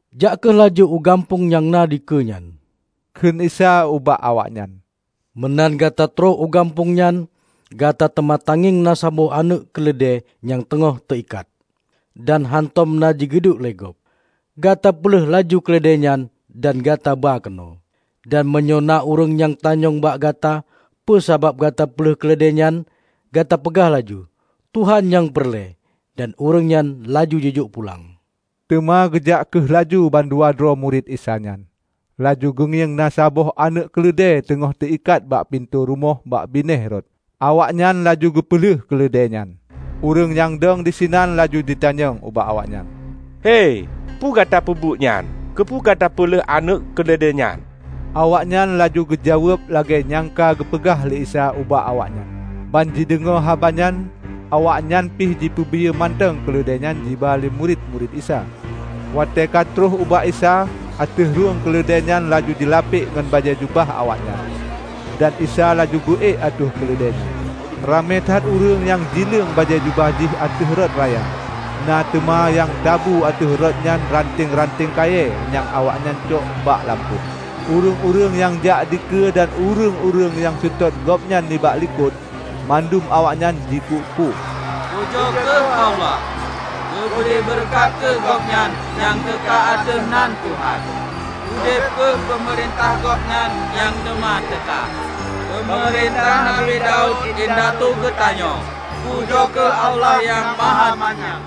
"Jak kheueh laju u gampông nyang na dikeue nyan," kheun Isa ubak awaknyan. "Meunan gata troh u gampông nyan, gata teuma tangieng na saboh aneuëk keuleudée nyang teungoh teu ikat, dan hántom na jigiduek lé gob. Gata peuleueh laju keuleudée nyan dan gata ba keunoe. Dan meunyoe na ureuëng nyang tanyong bak gata peusabab gata peuleueh keuleudée nyan, gata peugah laju, 'Tuhan nyang peureulée, dan ureuëng nyan laju jijok pulang.' " Teuma geujak kheueh laju mandua droe murit Isa nyan, laju geungieng na saboh aneuëk keuleudée teungoh teu ikat bak pintoe rumoh bak binéh rot. Awaknyan laju geupeuleueh keuleudée nyan. Ureuëng nyang dong disinan laju jitanyong ubak awaknyan, "Hei, peue gata peubuet nyan? Keupeue gata peuleueh aneuëk keuleudée nyan?" Awaknyan laju geujaweueb lagée nyang ka geupeugah lé Isa ubak awaknyan. Ban jideungoe haba nyan, awaknyan pih jipeubiyeu mantong keuleudée nyan jiba lé murit-murit Isa. Watée ka troh ubak Isa, ateueh rhung keuleudée nyan laju jilapek ngon bajée jubah awaknyan, dan Isa laju geu-ék ateueh keuleudée nyan. Ramé that ureuëng nyang jileueng bajée jubah jih ateueh rot raya, na teuma nyang tabu ateueh rot nyan ranteng-ranteng kayée nyang awaknyan cok bak lampôh. Ureuëng-ureuëng nyang jak dikeue dan ureuëng-ureuëng nyang seutôt gobnyan nibak likot, mandum awaknyan jikuk-kuk, "Pujoe kheueh Allah! Geubri beureukat kheueh Gobnyan nyang teuka ateueh nan Tuhan! Udeb kheueh peumeurintah Gobnyan nyang teuma teuka -- peumeurintah Nabi Daud indatu geutanyoe! Pujoe kheueh Allah Nyang Mahamanyang!"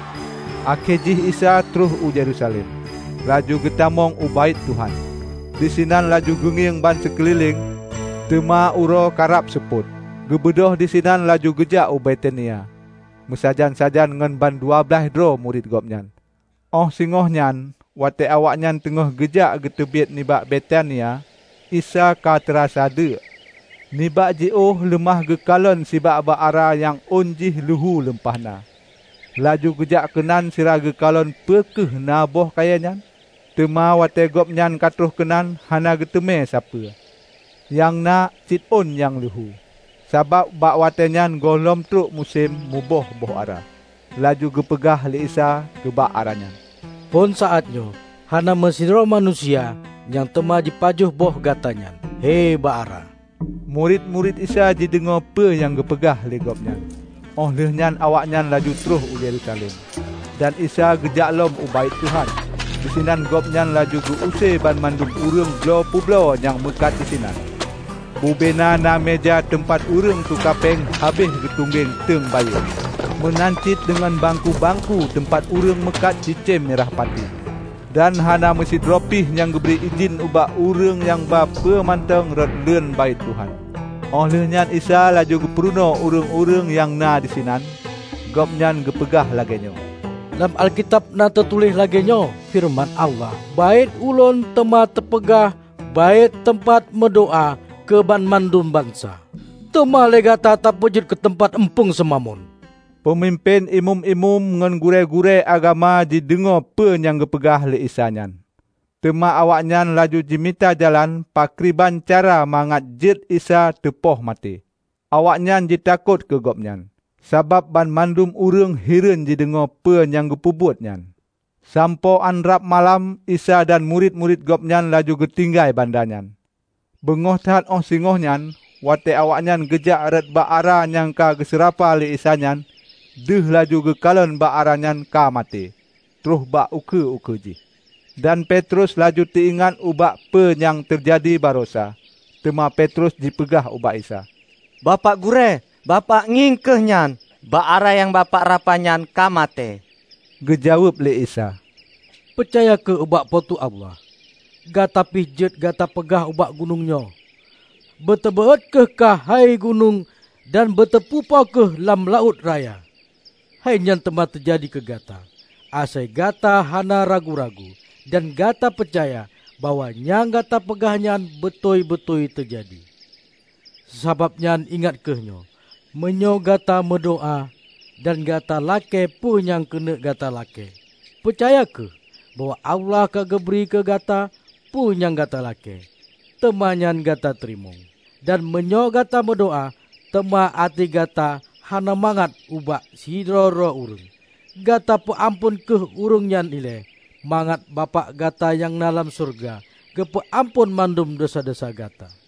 Akhé jih Isa troh u Yerusalem, laju geutamong u Baét Tuhan. Disinan laju geungieng bansikeulileng. Teuma uroe karab seupôt, geubeudôh sinan laju geujak u Betania meusajan-sajan ngon bandua blaih droe murit Gobnyan. Óh singoh nyan, watée awaknyan teungoh geujak geuteubiet nibak Betania, Isa ka teurasa deuek. Nibak jiôh leumah geukalon sibak bak ara nyang ôn jih luhu lumpah na. Laju geujak keunan sira geukalon peu kheueh na boh kayée nyan. Teuma watée Gobnyan ka troh keunan hana geuteumé sapeue, nyang na cit ôn nyang luhu, sabab bak watée nyan gohlom troh musém muboh boh ara. Laju geupeugah lé Isa keu bak ara nyan, "Phon saát nyoe hana meusidroe manusia nyang teuma jipajoh boh gata nyan, hei bak ara!" Murit-murit Isa jideungoe peu nyang geupeugah lé gobnyan. Óh lheueh nyan awaknyan laju troh u Yerusalem, dan Isa geujak lom u Baét Tuhan. Disinan Gobnyan laju geu-use banmandum ureuëng bloe peubloe nyang meukat disinan. Bubena na meuja teumpat ureuëng tuka péng habéh geutunggeng teungbayeueng, meunan cit deungon bangku-bangku teumpat ureuëng meukat cicém mirah pati. Dan hana meusidroe pih nyang geubri idhin ubak ureuëng nyang ba peue mantong rot leuen Baét Tuhan. Óh lheueh nyan Isa laju geupurunoe ureuëng-ureuëng nyang na disinan. Gobnyan geupeugah lagée nyoe, "Lam Alkitab na teutuléh lagée nyoe: Feureuman Allah, 'Baét Ulôn teuma teupeugah baét teumpat meudoá keu banmandum bansa.' Teuma lé gata tapeujeuet keuteumpat eumpung seumamon!" Peumimpén imeum-imeum ngon gurée-gurée agama jideungoe peu nyang geupeugah lé Isa nyan. Teuma awaknyan laju jimita jalan pakriban cara mangat jeuet Isa teupoh maté. Awaknyan jitakot keu Gobnyan, sabab banmandum ureuëng hireuen jideungoe peue nyang geupeubeuet nyan. Sampoe án rab malam, Isa dan murit-murit Gobnyan laju geutinggai banda nyan. Beungoh that óh singoh nyan, watée awaknyan geujak rot bak ara nyang ka geuseurapa lé Isa nyan, deuh laju geukalon bak ara nyan ka maté troh bak ukeue-ukeue jih. Dan Petrus laju teu ingat ubak peue nyang teujadi barosa. Teuma Petrus jipeugah ubak Isa, "Bapak Gurée, Bapak ngieng kheueh nyan! Bak ara nyang Bapak rapa nyan ka maté!" Geujaweueb lé Isa, "Peucaya kheueh ubak Po teu Allah. Gata pih jeuet gata peugah ubak gunong nyoe, 'Beuteubeuôt kheueh kah hei gunong dan beuteu pupo kheueh lam laôt raya!' Hei nyan teuma teujadi keu gata; asai gata hana ragu-ragu, dan gata peucaya bahwa nyang gata peugah nyan beutôi-beutôi teujadi. Sabab nyan ingat kheueh nyoe: Meunyoe gata meudoá dan gata lakée peue nyang keuneuk gata lakée, peucaya kheueh bahwa Allah ka geubri keu gata peue nyang gata lakée, teuma nyan gata tateurimong. Dan meunyoe gata meudoá, teuma até gata hana mangat ubak sidroe-droe ureuëng, gata peuamphon kheueh ureuëng nyan ilée, mangat Bapak gata nyang na lam syeuruga geupeu amphon mandum desya-desya gata.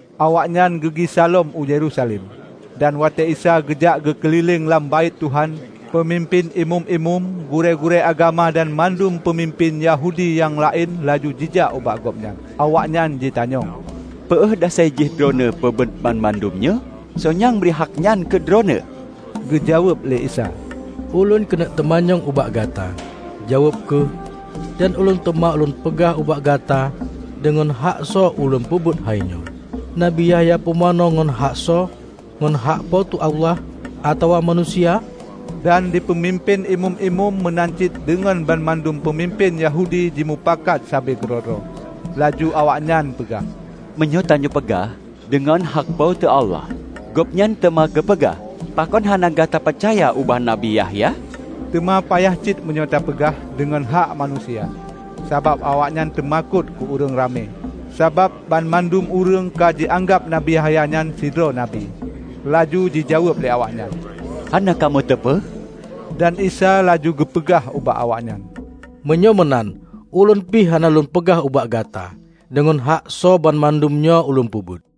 Awaknyan geugisa lom u Yerusalem. Dan watée Isa geujak geukeulileng lam Baét Tuhan, Peumimpén Imeum-imeum, gurée-gurée agama, dan mandum peumimpén Yahudi nyang laén laju jijak ubak Gobnyan. Awaknyan jitanyong, "Peue dasai jih droeneueh peubuet banmandum nyoe? Soe nyang bri hak nyan keu Droeneueh?" Geujaweueb lé Isa, "Ulôn keuneuk teumanyong ubak gata. Jaweueb kheueh dan Ulôn teuma Lôn peugah ubak gata deungon haksoe Ulôn peubuet hainyoe. Nabi Yahya Pumanö ngon hak soe, ngon hak Po teu Allah, atawa manusia?" Dan di Peumimpén Imeum-imeum meunan cit deungon banmandum peumimpén Yahudi jimupakat sabe keudroe-droe. Laju awaknyan peugah, "Meunyoe tanyoe peugah, 'Deungon hak Po teu Allah,' Gobnyan teuma geupeugah, 'Pakon hana gata peucaya ubak Nabi Yahya?' Teuma payah cit meunyoe tapeugah, 'Deungon hak manusia.' " Sabab awaknyan teumakot keu ureuëng ramé, sabab banmandum ureuëng ka jianggab Nabi Yahya nyan sidroe Nabi. Laju jijaweueb lé awaknyan, "Hana kamoe teupeu." Dan Isa laju geupeugah ubak awaknyan, "Meunyoe meunan, ulôn pih hana lôn peugah ubak gata deungon hak soe banmandum nyoe ulôn peubuet."